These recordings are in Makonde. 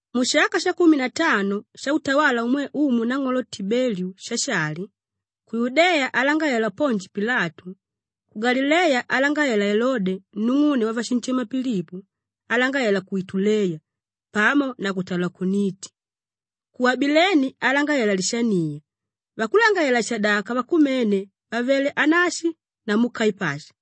Mushaka shakumi na tano shautawala umwe Umu Nang'olo Tibeliu Shashali, ku Yudeya alangalalela Ponji Pilatu, ku Galileya alangalalela Elode nung'une wavashinshema Pilipo alangalalela ku Ituleya pamo na ku Talakoniti, ku Abileni alangalalela Lishaniya, vakulangalalela-shadaka vakumene vàvele Anashi namu Kaipashi,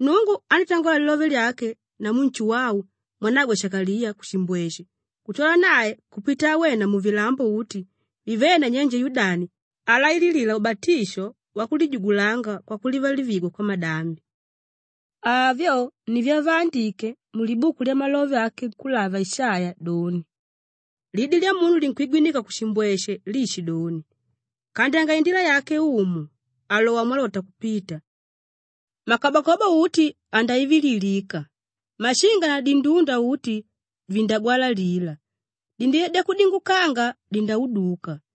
Nnungu andítangola lilove lyake namu Nshuwau mwanagwe Shakaliya kushimbweshe kutwala nae kupita awena muvilambo uti vivéle nanyenje Yudani alaililila ubatisho wakulijugulanga kwakulivalivigwa kwamadambi. Avyo ni vyavaandike mulibuku lyamalove ake nkúlava Ishaiya doni, “Lidi lyamunu linkwigwinika kushimbweshe liishidoni, ‘Kandyanga indila yake Umu, aalowa mwalota kupita. Makabakobo uti andaivililika, mashinga na dindunda uti vindagwalalila, dindila dyakudingukanga dindauduka,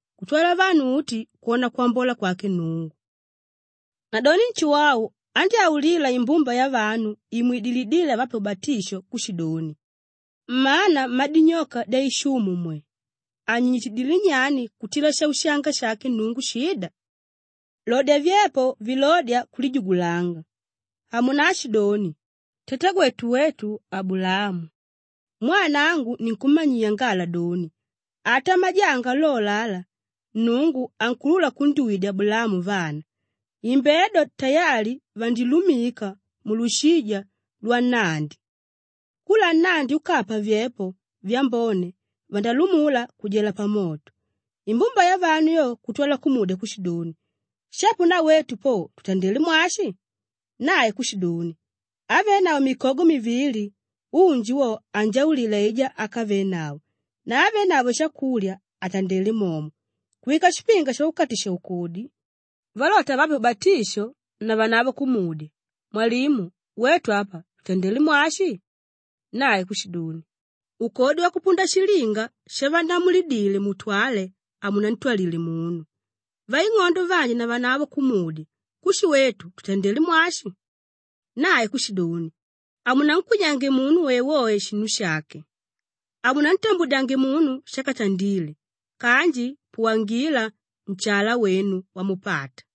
kutwala vanu uti kwona kwambola kwake Nnungu.’” Nadoni Nshuwau andyáulila imbumba yavanu imwidilíle avape ubatisho kushidoni, “Mmana mmadinyoka dyaishumu mwe! Anyinyitidilé nyani kutila shaushanga shake Nnungu shida? Lodya vyepo vilódya kulijugulanga. Hamunaashidoni, ‘Tatagwetu wetu Abulaamu.’ Mwaa nangu ninkummanyiya ngala doni, ata majanga lolo ala, Nnungu ankuulula kundyuwidya Abulaamu vana. Imbedo tayali vandilumika mulushija lwannandi. Kula nnandi úkapa vyepo vyambone vandálumula kujela pamoto.” Imbumba yavanu yo kutwala kumudya kushidoni, “Shapo na wetu po tutandelé mwashi?” Nae kushidoni, “Ávenavo mikogo mivili, unji wo anjaulile aijá ákavenavo na ávenavo shakulya atandele momo.” Kuwika shipinga shavakukatisha-ukodi valota avape ubatisho, navanavo kumudya, “Mwalimu, wetu apa tutandele mwashi?” Nae kushidoni, “Ukodi wakupunda shilinga shavannamulidile mutwale, hamunantwalile munu.” Vaing'ondo vanji navanavo kumudya, “Kushi wetu tutandele mwashi?” Nae kushidoni, “Hamunankwinyange munu woewoe shinu shake, hamunantambudyange munu shákatandile kanji puwangila nshala wenu wamupata.”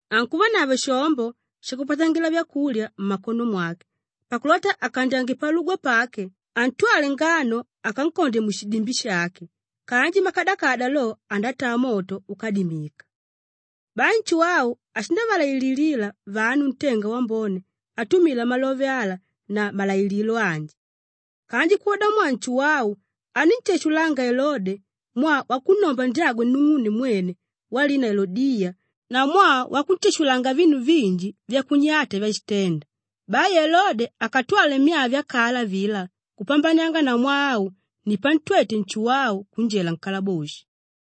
Ankuvanavo shombo shakupatangila vyakulya mmakono mwake pakulota akandyange palugwa pake antwale ngano akankondye mushidimbi shake kanji makadakada lo, andataa moto úkadimika.” Bai Nshuwau ashindavalaililila vanu ntenga wambone atumila malove ala na malailililo anji. Kanji kwodamwaa Nshuwau anínshashulanga Elode mwaa wakunnomba ndyagwe nung'une mwene walina Elodiya na mwaa wakunshashulanga vinu vinji vyakunyata vyashitenda, bai Elode akatwale myaa vyakala avilá kupambanianga na mwaa au ni pantwete Nshuwau kunjela nkalaboshi.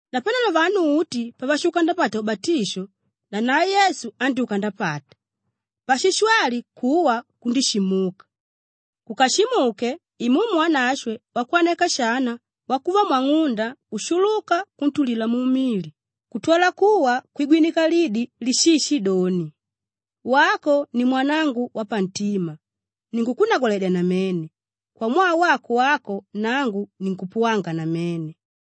Napanelo vanu uti pavashuka ndapata ubatisho, nanae Yesu andyúka ndapata. Pashishwali kuwa kundíshimuka; kukashimuke, Imumu Wanashwe wakwaneka shana wakuva mwang'unda kushuluka kuntulila mumili kutwala kuwa kwigwinika lidi lishishidoni, “Wako ni umwanangu wapantima, ninkukunnagwaledya namene; kwamwaa wako wako nangu ninkupuwanga namene.”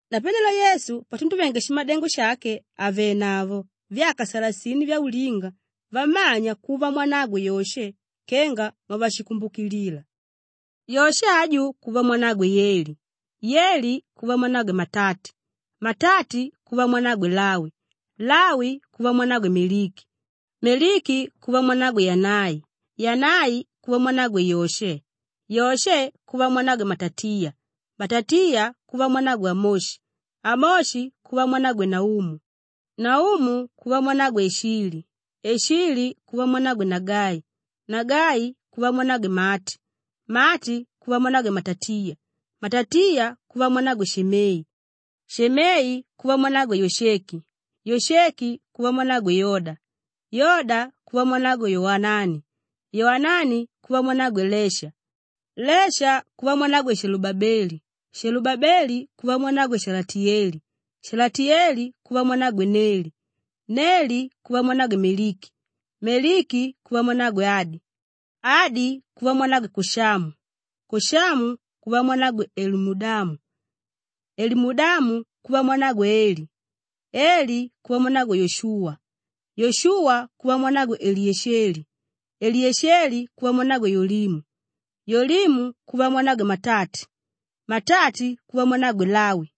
Napanelo Yesu patunduvenge shimadengo shake àvenavo vyaka salasini vyaulinga vammanya kuva mwanagwe Yoshe kenga mwavashikumbukilila, Yoshe aju kuva mwanagwe Yeli, Yeli kuva mwanagwe Matati, Matati kuva mwanagwe Lawi, Lawi kuva mwanagwe Meliki, Meliki kuva mwanagwe Yanai, Yanai kuva mwanagwe Yoshe, Yoshe kuva mwanagwe Matatiya, Matatiya kuva mwanagwe Amoshi, Amoshi kuva mwanagwe Naumu, Naumu kuva mwanagwe Eshili, Eshili kuva mwanagwe Nagai, Nagai kuva mwanagwe Maati, Maati kuva mwanagwe Matatiya, Matatiya kuva mwanagwe Shemei, Shemei kuva mwanagwe Yosheki, Yosheki kuva mwanagwe Yoda, Yoda kuva mwanagwe Yowanani, Yowanani kuva mwanagwe Lesha, Lesha kuva mwanagwe Shelubabeli, Shelubabeli kuva mwanagwe Shalatiyeli, Shalatiyeli kuva mwanagwe Neli, Neli kuva mwanagwe Meliki, Meliki kuva mwanagwe Adi, Adi kuva mwanagwe Koshamu, Koshamu kuva mwanagwe Elimudamu, Elimudamu kuva mwanagwe Eli, Eli kuva mwanagwe Yoshuwa, Yoshuwa kuva mwanagwe Eliyesheli, Eliyesheli kuva mwanagwe Yolimu, Yolimu kuva mwanagwe Matati, Matati kuva mwanagwe Lawi,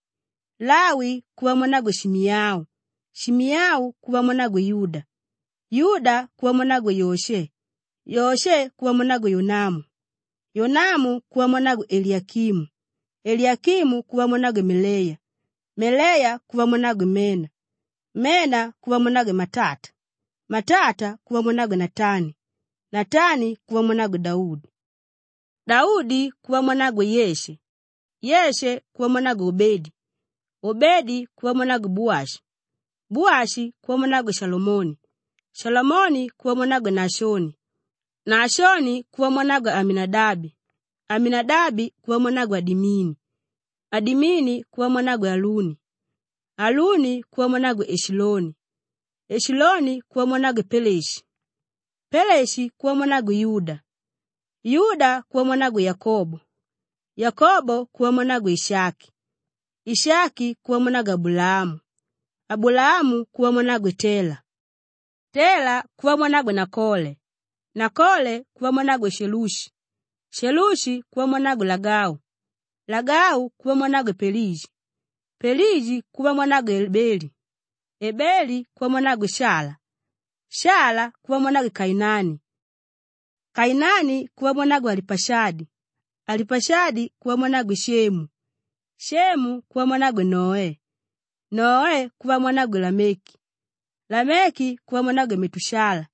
Lawi kuva mwanagwe Shimiyau, Shimiyau kuva mwanagwe Yuda, Yuda kuva mwanagwe Yoshe, Yoshe kuva mwanagwe Yonamu, Yonamu kuva mwanagwe Eliyakimu, Eliyakimu kuva mwanagwe Meleya, Meleya kuva mwanagwe Mena, Mena kuva mwanagwe Matata, Matata kuva mwanagwe Natani, Natani kuva mwanagwe Daudi, Daudi kuva mwanagwe Yeshe, Yeshe kuva mwanagwe Obedi, Obedi kuva mwanagwe Buwashi, Buwashi kuva mwanagwe Shalamoni, Shalamoni kuva mwanagwe Naashoni, Naashoni kuva mwanagwe Aminadabi, Aminadabi kuva mwanagwe Adimini, Adimini kuva mwanagwe Aluni, Aluni kuva mwanagwe Eshiloni, Eshiloni kuva mwanagwe Peleshi, Peleshi kuva mwanagwe Yuda, Yuda kuva mwanagwe Yakobo, Yakobo kuva mwanagwe Ishaki, Ishaki kuva mwanagwe Abulaamu, Abulaamu kuva mwanagwe Tela, Tela kuva mwanagwe Nakole, Nakole kuva mwanagwe Shelushi, Shelushi kuva mwanagwe Lagau, Lagau kuva mwanagwe Pelegi, Pelegi kuva mwanagwe Ebeli, Ebeli kuva mwanagwe Shala, Shala kuva mwanagwe Kainani, Kainani kuva mwanagwe Alipashadi, Alipashadi kuva mwanagwe Shemu, Shemu kuva mwanagwe Noe, Noe kuva mwanagwe Lameki, Lameki kuva mwanagwe Metushala,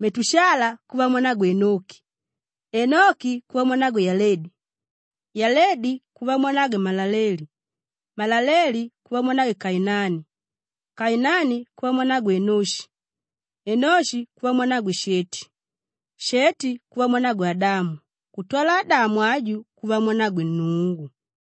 Metushala kuva mwanagwe Enoki, Enoki kuva mwanagwe Yaledi, Yaledi kuva mwanagwe Malaleeli, Malaleeli kuva mwanagwe Kainani, Kainani kuva mwanagwe Enoshi, Enoshi kuva mwanagwe Sheti, Sheti kuva mwanagwe Adamu kutwala Adamu aju kuva mwanagwe Nnungu.